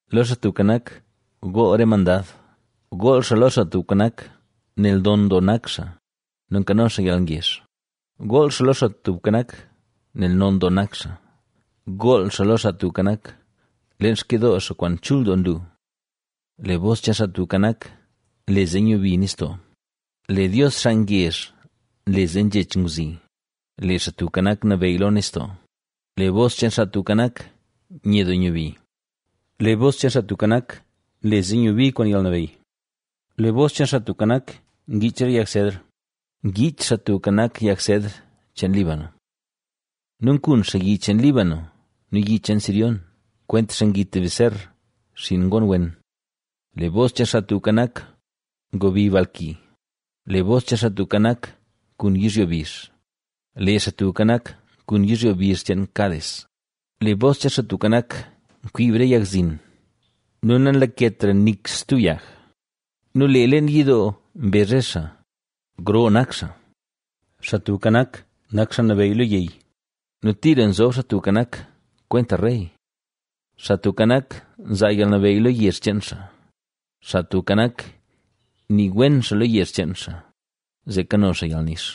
Lo Xaa Tubka Nak, gool re mandad, gool xaa lo Xaa Tubka Nak, nel non doo nak xaa nu nkano xaa yalngezh, gool xaa lo Xaa Tubka Nak, nel non doo nak xaa, gool xaa lo Xaa Tubka Nak, leen xkidoo xaa kwaan chul doo nlu. Lee bos cheen Xaa Tubka Nak, nle zee nyubi nistoo; lee Dios xaa ngezh nle zee nzhech ngwzi; ¡Lee Xaa Tubka Nak, nabeyy lo nistoo! Lee bos cheen, Xaa Tubka Nak, nye doo nyubi. Lee bos cheen, Xaa Tubka Nak, nle zee nyubi kwaan yalnabeyy. Lee bos cheen, Xaa Tubka Nak, ngiich re yag sedr. ¡Ngiich Xaa Tubka Nak yag sedr cheen Líbano! Nu nkun xaa yi cheen Líbano nu yi cheen Sirióna, kwentaxa ngit beser, xinn ngoon wen. Lee bos cheen Xaa Tubka Nak, ngobi bal ki; lee bos cheen Xaa Tubka Nak nkun yizhyo bizh. ¡Lee Xaa Tubka Nak nkun yizhyo bizh cheen Cades! Lee bos cheen Xaa Tubka Nak, nkwiib re yag zin nu nalaketra nik stub yag nu lee leen yidoo mbezh re xaa: “¡Gro nak xaa!” Xaa Tubka Nak nak xaa nabeyy lo yey nu tira nzob Xaa Tubka Nak kwenta rey. Xaa Tubka Nak nzaa yalnabeyy lo yezh cheen xaa; Xaa Tubka Nak nii wen xaa lo yezh cheen xaa, zee kano xaa yalnix.